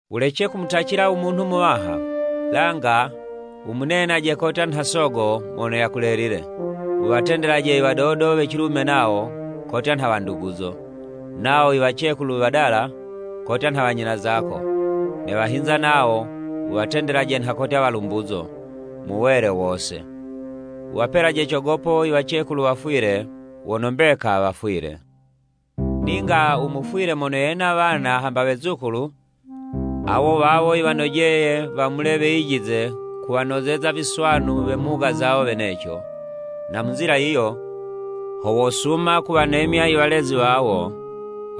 Wulece kumutacila u munhu muwaha, langa wumunenaje kotya nha Sogo mono yakulelile. Wuwatendele Iwadodo we cilume nawo, kotya nha wanduguzo, nawo iwacekulu wadala, kotya nha wanyina zako, ne wahinza nawo, wuwatendelaje nha kotya walumbuzo, mu wele wose. Wuwapelaje cogopo iwacekulu wafwile wono mbeka wafwile. Ninga u mufwile mono yena wana hamba wezukulu, awo wawo yiwanojeye wamule weyijize kuwanozeza viswanu we mhuga zawo weneco, na mu nzila yiyo, ho wosuma kuwanemya i walezi wawo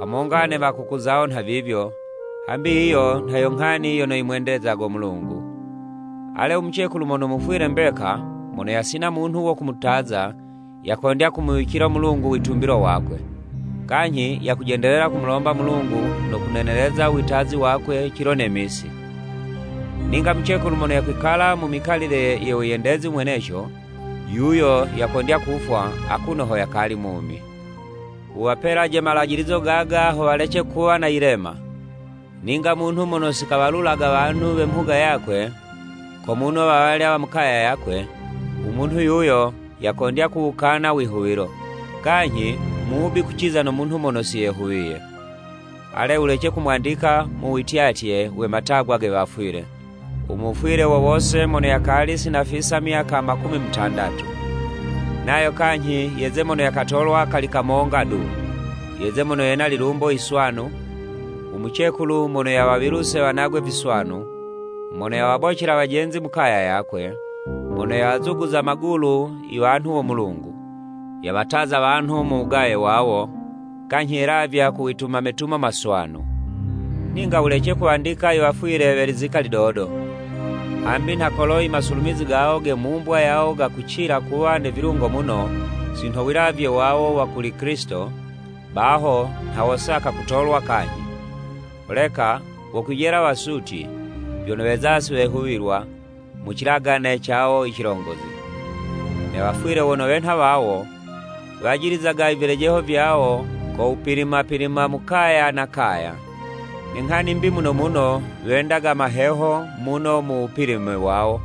hamonga ne wakuku zawo nhavivyo, hambi yiyo nha yo nghani yono yimwendezago Mulungu. Ale, umucekulu mono mufwile mbeka, mono yasina munhu wo kumutaza, yakondya kumuwicilo Mulungu witumbilo wakwe, kanyhi yakujendelela kumulomba Mulungu no kuneneleza u wutazi wakwe cilo ne misi. Ninga mucekulu mono yakwikala mu mikalile yo wiyendezi mweneco, yuyo yakondya kufwa akuno ho yakali mumi. Wuwapelaje malajilizo gaga, ho walece kuwa na yilema. Ninga munhu mono si kawalulaga wanhu we mhuga yakwe, ko muno wawalya wa mu kaya yakwe, umunhu yuyo yakondya kuwukana wihuwilo, kanyhi mubi kuciza no munhu mono siyehuwiye. Ale, wulece kumwandika mu wityatye we matagwa ge wafwile, u mufwile wo wose mono yakali sinafisa myaka makumi mutandatu. Nayo kanyhi yeze mono yakatolwa kali kamonga du, yeze mono yena lilumbo yiswanu, umucekulu mono yawawiluse wanagwe viswanu, mono yawabocela wajenzi mukaya yakwe, mono yawazuguza magulu iwanhu wo Mulungu, yawataza wanhu mu wugaye wawo, kanyhi yelavya ku wituma metumo maswanu. Ninga wulece kuwandika i wafwile we lizika lidodo, hambi nha kolo i masulumizi gawo ge mumbwa yawo gakucila kuwa ne vilungo muno, si nho wilavye wawo wa kuli Kilisito, baho nha wosaka kutolwa kanyhi, holeka wokwijela wasutyi, vyono weza si wehuwilwa mu cilagane cawo i cilongozi. Ne wafwile wono wenha wawo wajilizaga i vilejeho vyawo ko wupilima-pilima mu kaya na kaya. Ne nghani 'mbi muno muno, wendaga maheho muno mu wupilime wawo,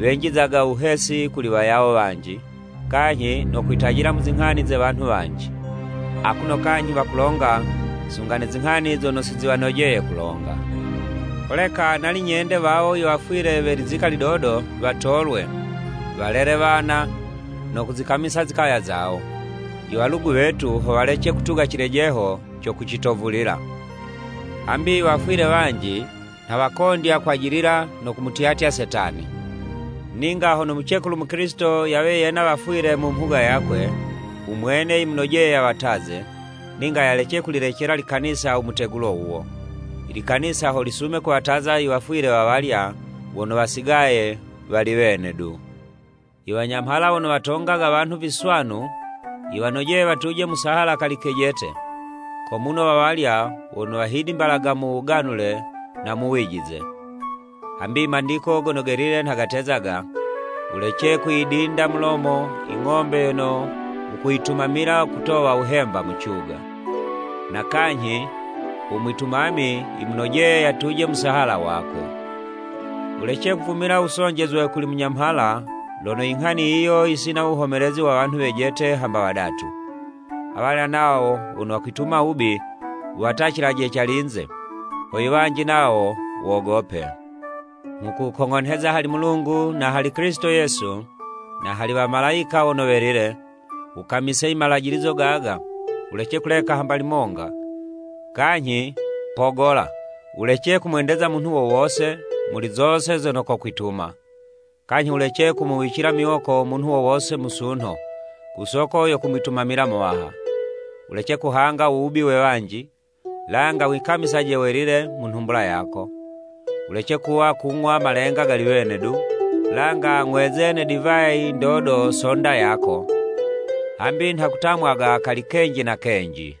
wenjizaga wuhesi kuli wayawo wanji, kanyhi no kwitajila mu zinghani ze wanhu wanji, akuno kanyhi wakulonga sunga ne zinghani zono siziwanojeye kulonga. Holeka nali nyende wawo i wafwile we lizika lidodo watolwe, walele wana no kuzikamisa zikaya zawo, iwalugu wetu ho walece kutuga cilejeho co kucitovulila. Hambi iwafwile wanji nha wakondya kwajilila no kumutyatya Setani. Ninga hono mucekulu Mukilisito yawe yena wafwile mu mhuga yakwe, umwene yimunojeye yawataze, ninga yalece kulilecela likanisa u mutegulo wuwo, i likanisa ho lisume kuwataza iwafwile wawalya wono wasigaye wali wene du. Iwanyamhala wono watongaga wanhu viswanu yiwanojeye watuje musahala kali kejete, ko muno wawalya wono wahidimbalaga mu wuganule na mu wijize. Hambi i Mandiko Gono Gelile nha gatezaga: “Wulece kuyidinda mulomo i ng'ombe yono wukuyitumamila kutowa wuhemba mu cuga,” na kanyhi, “Umwitumami yimunojeye yatuje musahala wakwe.” Wulece kuvumila wusonjezwe kuli munyamhala, lono i nghani yiyo yisina wuhomelezi wa wanhu wejete hamba wadatu. Awalya nawo wono wakwituma wubi, wuwatacilaje calinze, ho iwanji nawo wogope. Nghukukong'onheza hali Mulungu, na hali Kilisito Yesu, na hali wamalayika wono welile, wukamise imalajilizo gaga wulece kuleka hamba limonga, kanyhi, pogola, wulece kumwendeza munhu wo wose muli zose zono kokwituma. Kanyhi wulece kumuwicila miwoko munhu wo wose musunho, ku soko yo kumwitumamila Muwaha. Wulece kuhanga u wubi we wanji, langa wikamisaje welile mu nhumbula yako. Wulece kuwa kung'wa malenga gali wene du, langa 'ng'weze ne divayi ndodo so'nda yako, hambi nha kutamwaga kali kenji na kenji.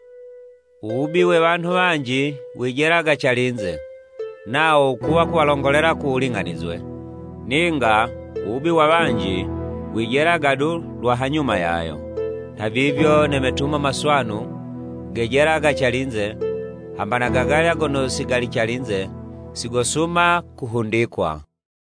Uwubi we wanhu wanji wijelaga calinze, nawo wukuwa kuwalongolela ku wuling'anizwe, ninga wubi we wanji, wijelaga du lwa hanyuma yayo. Nhavivyo, ne metumo maswanu gejelaga calinze, hamba na gagalya gono si gali calinze, sigosuma kuhundikwa.